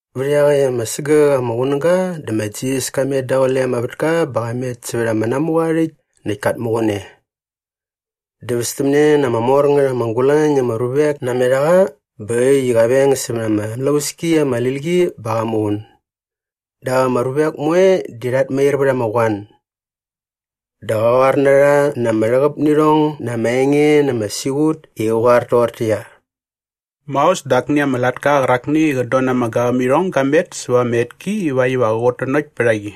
Vät iaqäkt ama sägäk ama qunäga dä ma Jisas ka met daqule ama vätka bä qa met sävät ama namuqa aa rhäkt näkt kat muqun e. Dä västämne na ama mor ngät ama gulañ na ama ruvek namet a qa bä äkt i qa veng sämät ama mlauski ama lil qi bä qa muqun. Dap ama ruvek moe di rhat mair vät ama qoan. Dä qa qoar na rha na ama rhäqäp nä irhong na ama enge na ama siqut i qä qoar toqortäqyia, “Maos dä akni ama latka qärakni i qät don na ama gavämirhong ga met säva ama etki ivakt iva qä qutnanokt pät a qi.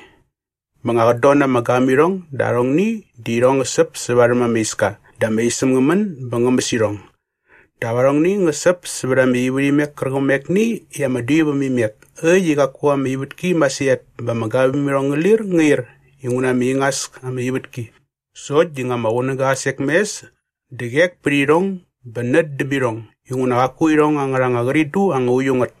Bä nga qät don na ama gavämirhong dä arhongni di irhong ngä säp sä varhäm ama iska dä ama isäm ngä män bä ngä mäs irhong. Dap arhongni ngä säp sävät ama ivärhimek kärqämekni i ama dui väm imek äkt i qaku ama ivätki masirhat bä ama gavämirhong ngä lir ngä ir inguna ama ingas ama ivätki. Sokt di nga ama qunäga qa sek mes dä qek pät irhong bä nät däm irhong inguna qaku irhong angärha anga qridu anga uiu ngät.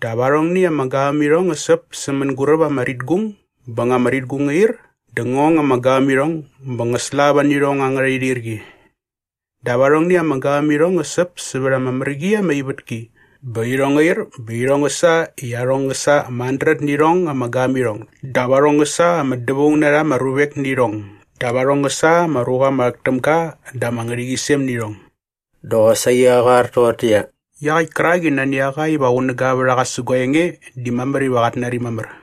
Dap arhongni ama gavämirhong ngä säp sä mänguräp ama ritgung bä nga ama ritgung ngä ir dä ngä ong ama gavämirhong bä ngä slava nä irhong angärha irhirqi. Dap arhongni ama gavämirhong ngä säp sävät ama mär qi ama ivätki bä irhong ngä ir bä irhong ngä sa i arhong ngä sa ama handret nä irhong ama gavämirhong dap arhong ngä sa ama dävaung na rha ama ruvek nä irhong dap arhong ngä sa ama ruqa ama rhäk täm ga da ama ngärhäqyisem nä irhong.” Dä qosaqi qa qoar toqortäqyia, “Iaqäkt kärak i nani a qa iva qunäga vät a qa sä gua enge di mamär iva qat nari mamär.”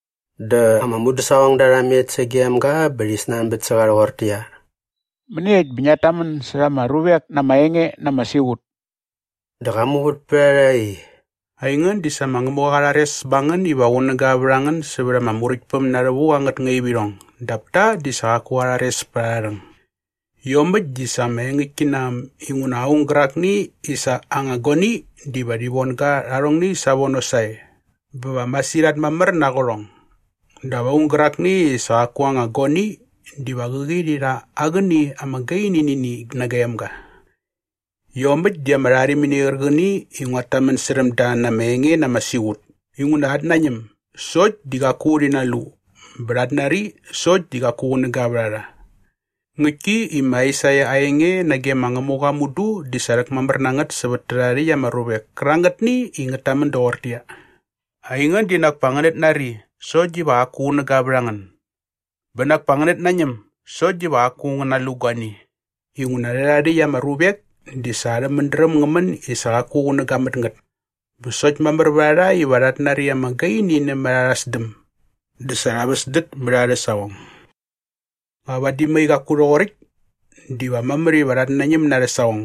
Dä ama mudäsaqongda rha met sagem ga bä rhi snanbät sä qa rhoqortäqyia, “Mäniekt bä ngiat tamän särha ama ruvek na ama enge na ama siqut?” Dä qa muvät pät a rha i, “Aingän di sa ma Ngämuqa qa rhares ba ngän iva qunäga vät a ngän sävät ama Muräktpäm na rhävuk angät ngaivirhong dap ta di sa qaku qa rhares pät arha rhäng. Iomäkt di sa ama engäktki na äm inguna aung gärakni i sa aa anga guani diva rhi von ga rha arhongni savono sae bä va masirhat mamär na aa qärhong. Dap aung gärakni i sa qaku aa anga guani diva qäqi rhi rha aa qäni ama gaini nä ini nagem ga. Iomäkt di ama rharimini qärqäni i nguat tamän särhäm da na ama enge na ama siqut. Inguna rhat nañäm sokt di qaku rhi nalu bä rhat nari sokt di qaku qunäga vät a rha. Ngäktki i ma Aisaia aa enge nage ma Ngämuqa mudu di sa rhäkmamär na ngät sävät tärhae rhäkt ama ruvek kärangätni i ngät tamän doqortäqyia, “‘ “Aingän di nak pa ngänät nari sokt diva qaku qunäga vät a ngän bä nak pa ngänät nañäm sokt diva qaku ngän nalu guani.” Inguna rhärhae rhäkt ama ruvek di sa arhä mädräm ngä män i sa qaku qunäga mät ngät bä sokt mamär vät a rha iva rhat nari ama gaini nämät arha sdäm dä sa rha väsdät mät arhä saqong. Nga vadi mai qaku rhoqoräkt diva mamär iva rhat nañäm na arhä saqong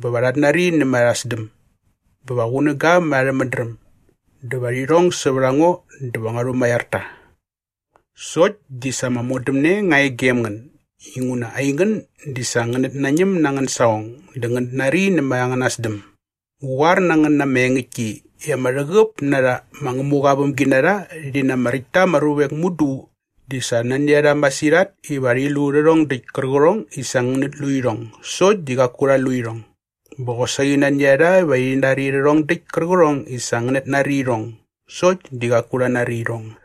bä va rhat nari nämät arha sdäm bä va qunäga mät arhä mädräm dä va rhi rhong sävät a ngo dä va ngua rhumaiar ta.’ Sokt di sa ama modämne nga e gem ngän inguna aingän di sa ngänät nañäm na angän saqong dä ngänät nari nämät angäna sdäm. Ngu qoar na ngän na ama engäktki i ama rhäqäp na rha ma Ngämuqa aa vämginarha rhi na ama räkt ta ama ruvek mudu di sa nani a rha masirhat iva rhi lu rhärhong däkt kärqärhong i sa ngänät lu irhong sokt di qaku rha lu irhong. Bä qosaqi nani a rha iva rhi nari rhärhong däkt kärqärhong i sa ngänät nari irhong sokt di qaku rha nari irhong.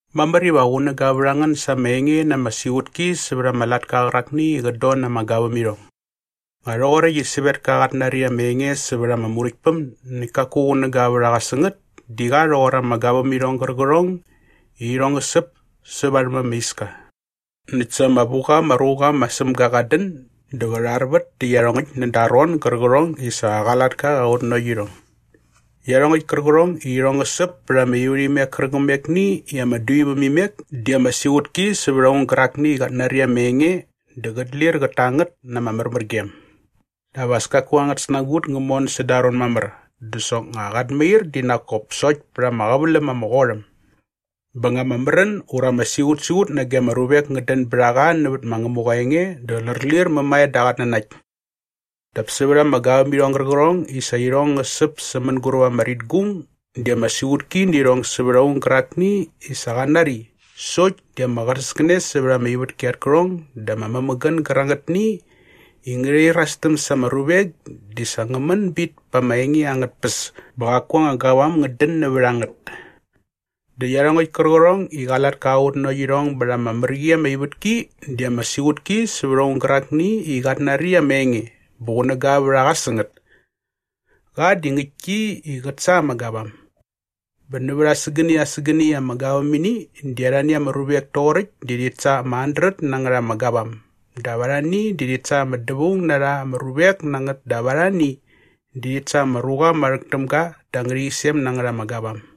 “Mamär iva qunäga vät a ngän sa ama enge na ama siqutki sävät ama latka qärakni i qät don na ama gavämirhong. Nga rhoqoräkt i sävetka qat nari ama enge sävät ama Muräktpäm näkt kaku qunäga vät a qa sä ngät di qa rhoqor ama gavämirhong gärqärhong i irhong ngä säp sä varhäm ama iska. Näkt sa ama vu qa ama ruqa ma Sämga qat dän dä qä rharvät dä iarhongäkt näda aa ron gärqärhong i sa qa latka qa qutnanokt irhong. Iarhongäkt kärqärhong i irhong ngä säp pät ama ivärhimek kärqämekni i ama dui väm imek di ama siqutki sävät aung gärakni i qat nari ama enge dä qät lir qät ta ngät na ama märmärgem. Dap as kaku angät snagut ngä mon säda aa ron mamär dä soknga qat mair di nak kop sokt pät ama qäväläm ama qot äm. Bä nga ama märän ura ama siqutsiqut nage ama ruvek ngät dän bät a qa nävät ma Ngämuqa aa enge dä lärlir mämae da aa qatnanakt. “Dap sävät ama gavämirhong gärqärhong i sa irhong ngä säp sä mänguräp ama ritgung di ama siqutki nä irhong sävät aung gärakni i sa qa nari sokt di ama qänäskänes sävät ama ivätki at kärhong dä ama mämägän gärangätni i ngärhi irastäm sa ama ruvek di sa ngä män bit pa ama enge angät tpäs bä qaku anga gavam ngät dän nävät a ngät. Dä iarhongäkt kärqärhong i qa latka qa qutnanokt irhong bät ama mär qi ama ivätki di ama siqutki sävät aung gärakni i qat nari ama enge bä qunäga vät a qa sä ngät. Qa di ngäktki i qät sa ama gavam. Bä nävät asägäni asägäni ama gavämini di arhani ama ruvek toqoräkt di rhit sa ama handret na ngät ama gavam dap arhani di rhit sa ama dävaung na rha ama ruvek na ngät dap arhani di rhit sa ama ruqa ama rhäk täm ga da ama ngärhäqyisem na ngät ama gavam.”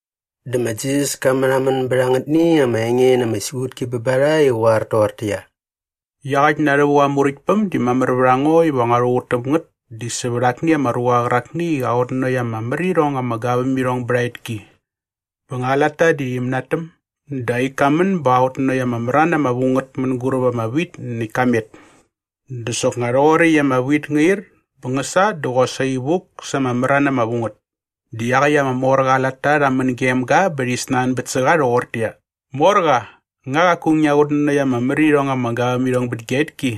Dä ma Jisas ka märhamän bät angätni ama enge na ama siqutki bä ba rha i qä qoar toqortäqyia, “Iaqäkt na rhävuk aa Muräktpäm di mamär vät a ngo iva ngua rhuqut täm ngät di sävät akni ama ruqa qärakni i qa qutnanokt ama mär irhong ama gavämirhong bät aa etki. Bä nga aa latta di rhi mänatäm dä aa ik ka män bä qa qutnanokt ama mran ama vu ngät mänguräp ama wit näkt ka met. “Dä soknga nga rhoqoräkt i ama wit ngä ir bä ngä sa dä qosaqi vuk sa ama mran ama vu ngät. Dä iaqäkt ama morqa aa latta rha män gem ga bä rhi snanbät sä qa rhoqortäqyia, ‘Morqa, nga qaku ngia qutnanokt ama mär irhong ama gavämirhong bät gia etki?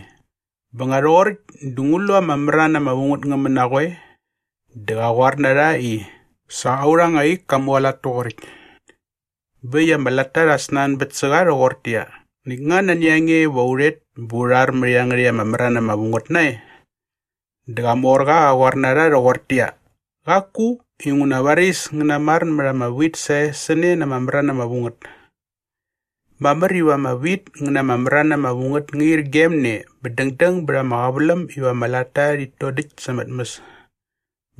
Bä nga rhoqoräkt dä ngu lu ama mran ama vu ngät ngä män na qoe?’ “Dä qa qoar na rha i, ‘Sa aurha anga ik ka mualat toqoräkt.’ Bä äkt i ama latta rha snanbät sä qa rhoqortäqyia, ‘Näkt nga nani a nge iva u rhet bä u rhar mät iangärhäkt ama mran ama vu ngät nae?’ “Dä qa morqa qa qoar na rha rhoqortäqyia, ‘Qaku inguna varis ngän namar mät anga wit sä ne na ama mran ama vu ngät. Mamär iva ama wit ngä na ama mran ama vu ngät ngärhi ir gem ne bä dängdäng bät ama qäväläm iva ama latta rhit dodäkt sa ama tmäs.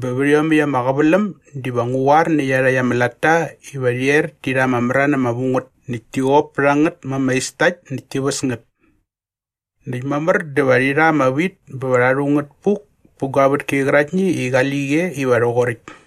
Bä vät iomäkt ama qäväläm diva ngu qoar nä iarhakt ama latta iva rhi er ti rha ama mran ama vu ngät näkt ti qop pät a ngät ma ama istakt näkt ti väs ngät. Näkt mamär dä va rhi rha ama wit bä va rha rhu ngät puk pä gua vätki qäraktni i qali qi e iva rhoqoräkt.’”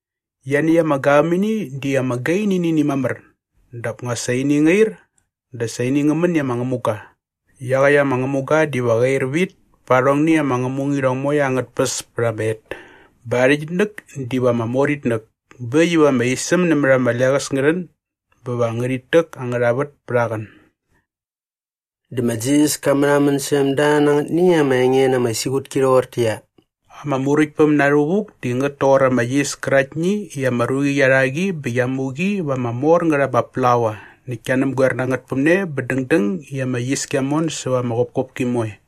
Ianiäkt ama gavämini di ama gaini nä ini mamär dap nga sa ini ngä ir dä sa ini ngä män i ama ngämuga. Iaqäkt ama ngämuga diva qä ir vit pa arhongni ama namuirhong moe angät tpäs pät ama et bä aa rhäqyitnäk diva ama mor itnäk bä äkt iva ama isäm nämät ama leqäs ngä rhän bä va ngärhit täk angärha vät pät aa qän.” Dä ma Jisas ka märhamän särhäm da na angätni ama enge na ama siqutki rhoqortäqyia, “Ama Muräktpäm na rhävuk di ngät toqor ama yis käraktni i ama ruqi qia rha qi bä qia mu qi va ama mor ngät ama plaua näkt kia näpgoer na ngät päm ne bä dängdäng i ama yis kia mon säva ama qopkopki moe.”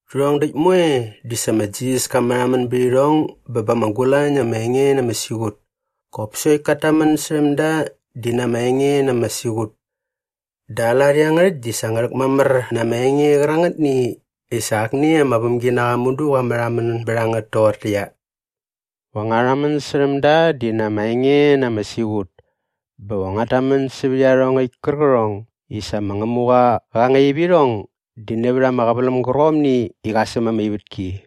Rhärhong däkt moe di sa ma Jisas ka märhamän bät irhong bä ba ama gulañ na ama enge na ama siqut. Qop sokt kat tamän särhäm da di na ama enge na ama siqut. Dä aa lat iangärhäkt di sa ngä rhäkmamär na ama enge qärangätni i sa akni ama vämginaqa mudu qa märhamän bät a ngät toqortäqyia, “Va ngua rhamän särhäm da di na ama enge na ama siqut bä va nguat tamän sävät iarhongäkt kärqärhong i sa ma Ngämuqa qa ngaip irhong di nävät ama qäväläm gärqomni i qa säm ama ivätki.”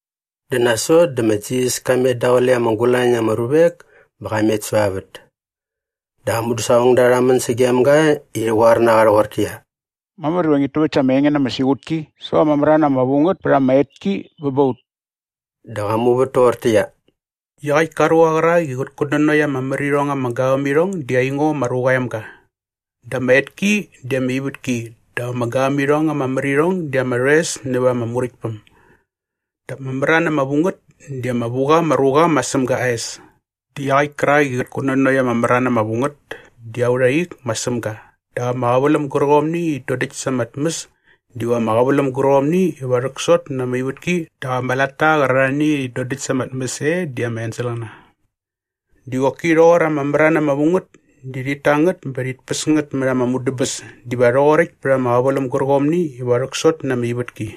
Dä nasot dä ma Jisas ka met daqule ama gulañ na ama ruvek bä qa met säva vät. Dä aa mudäsaqongda rha män sagem ga i rhi qoar na qa rhoqortäqyia, “Mamär iva ngit täväkt sa ama enge na ama siqutki sävät ama mran ama vu ngät pät ama etki bä ba ut.” Dä qa muvät toqortäqyia, “Iaqäkt ka ruqa qärak i qät kutnanokt ama mär irhong ama gavämirhong di aingo ma Ruqa aa Emga. Dä ama etki di ama ivätki dap ama gavämirhong ama mär irhong di ama rhoes näva ama Muräktpäm. Dap ama mran ama vu ngät di ama vu qa ama ruqa ma Sämga aa es. Dä iaqäkt kärak i qa qutnanokt ama mran ama vu ngät di aurha ik ma Sämga dap ama qäväläm gärqomni i rhit dodäkt sa ama tmäs diva ama qäväläm gärqomni iva rhäksot na ama ivätki dap ama latta qärarhani i rhit dodäkt sa ama tmäs e di ama enselqäna. “Di qoki rhoqor ama mran ama vu ngät di rhit ta ngät bä rhit päs ngät mät ama mudäbäs diva rhoqoräkt pät ama qäväläm gärqomni iva rhäksot na ama ivätki.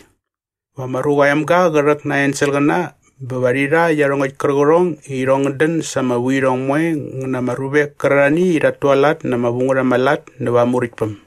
Va ma Ruqa aa Emga qä rhäk na aa enselqäna bä va rhi rha iarhongäkt kärqärhong i irhong ngät dän sa ama vuirhong moe ngä na ama ruvek kärarhani i rhat tualat na ama vu ngät ama lat näva aa Muräktpäm.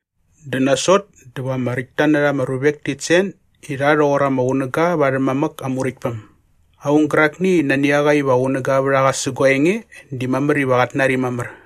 Dä nasot dä va ama räkt ta na rha ama ruvek tit sen i rha rhoqor ama qunäga va arhä mamäk aa Muräktpäm. Aung gärakni i nani a qa iva qunäga vät a qa sä gua enge di mamär iva qat nari mamär.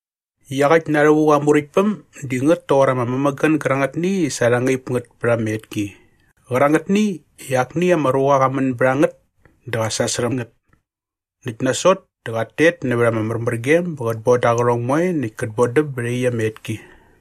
“Iaqäkt na rhävuk aa Muräktpäm di ngät toqor ama mämägän gärangätni i sa rha ngaip ngät pät ama etki qärangätni i akni ama ruqa qa män bät a ngät dä qa sasärhäm ngät. Näkt nasot dä qat tet nävät ama märmärgem bä qät boda aa qärhong moe näkt kät bodäm bät iaqyäkt ama etki.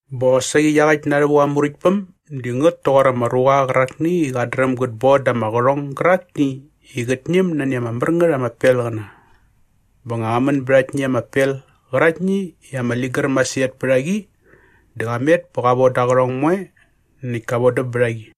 “Bä qosaqi iaqäkt na rhävuk aa Muräktpäm di ngät toqor ama ruqa qärakni i qat dräm gät boda ama qärhong gärakni i qät ñäm nani ama mär ngät ama pelqäna. Bä nga qa män bät aktni ama pel qäraktni i ama ligär masirhat pät a qi dä qa met bä qa voda aa qärhong moe näkt ka vodäm bät a qi.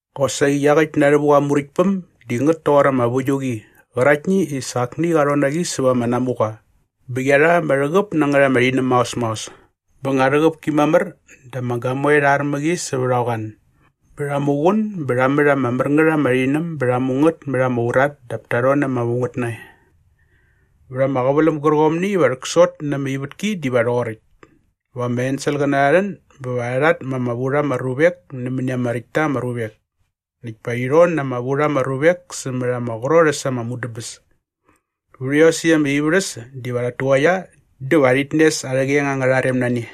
“Qosaqi iaqäkt na rhävuk aa Muräktpäm di ngät toqor ama väiuqi qäraktni i sa akni qa rhon na qi säva ama namuqa bä qia rha ama rhäqäp na ngät ama rhinäm maos maos. Bä nga rhäqäp ki mamär dä ama gamoe rha ar mä qi sävät ama qoan bä rha muqun bä rha mät ama mär ngät ama rhinäm bä rha mu ngät mät ama urat dap ta rhon na ama vu ngät nae. Vät ama qäväläm gärqomni iva rhäksot na ama ivätki diva rhoqoräkt. Va ama enselqäna rha rhän bä va rha rhatma ama vu rha ama ruvek nämäni ama räkt ta ama ruvek. Näkt pa rhi rhon na ama vu rha ama ruvek sämät ama qrot äs ama mudäbäs. Vät iosäkt ama ivärhäs diva rhat tuqaia dä va rhit nes arhä qeng angärha rem na ne.”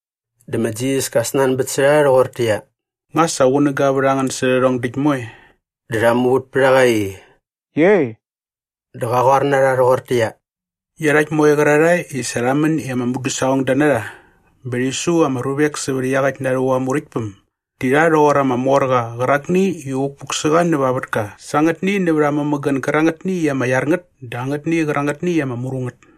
Dä ma Jisas ka snanbät sä rha rhoqortäqyia, “Nga sa qunäga vät a ngän sä rhärhong däkt moe?” Dä rha muvät pät a qa i, “Iei.” Dä qa qoar na rha rhoqortäqyia, “Iarhakt moe qärarhae i sa rha män i ama mudäsaqongda na rha bä rhi su ama ruvek sävät iaqäkt na rhävuk aa Muräktpäm di rha rhoqor ama morqa qärakni i vukpuk sä qa näva aa vätka sa angätni nävät aa mämägän gärangätni i ama iar ngät dä angätni qärangätni i ama mru ngät.”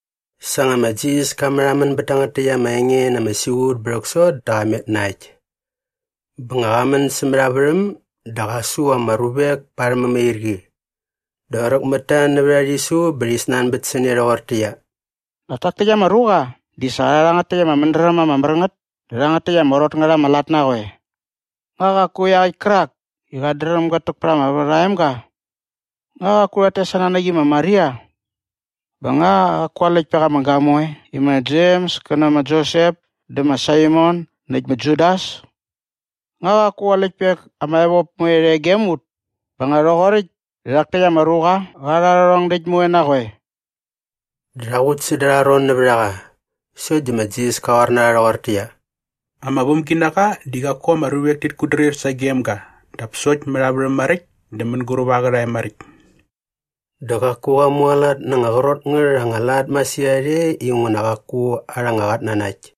Sa nga ma Jisas ka märhamän bät tangät täkt ama enge na ama siqut bä rhäksot dä qa met na äkt. Bä nga qa män sämät aa värhäm dä qa su ama ruvek pa arhä mämairqi. Dä qräk mät ta nävät aa rhisu bä rhi snanbät sä ne rhoqortäqyia, “Nak tak täkt ama ruqa di sa qa rha rhangät täkt ama mädräm ama mär ngät dä rhangät täkt ama qrot ngät ama lat na qoe? Nga qaku iaqäkt kärak i qat dräm gät täk pät ama vät aa emga? Nga qaku rhat tes aa nanäk i ma Maria? Bä nga qaku aa läktpek ama gamoe i ma Jems kä nä ma Josep dä ma Saimon näkt ma Judas? Nga qaku aa läktpek ama evop moe rhe gem ut? Bä nga rhoqoräkt dä rhak täkt ama ruqa qa rha rhärhong däkt moe na qoe?” Dä rha qut säda arha ron nävät a qa. Sokt di ma Jisas ka qoar na rha rhoqortäqyia, “Ama vämginaqa di qaku ama ruvek tit kutdrir sagem ga dap sokt mät aa värhäm maräkt dä mänguräp aa qärhae maräkt.” Dä qaku qa mualat na anga qrot ngät anga lat masirhat e inguna qaku arha anga qatnanakt.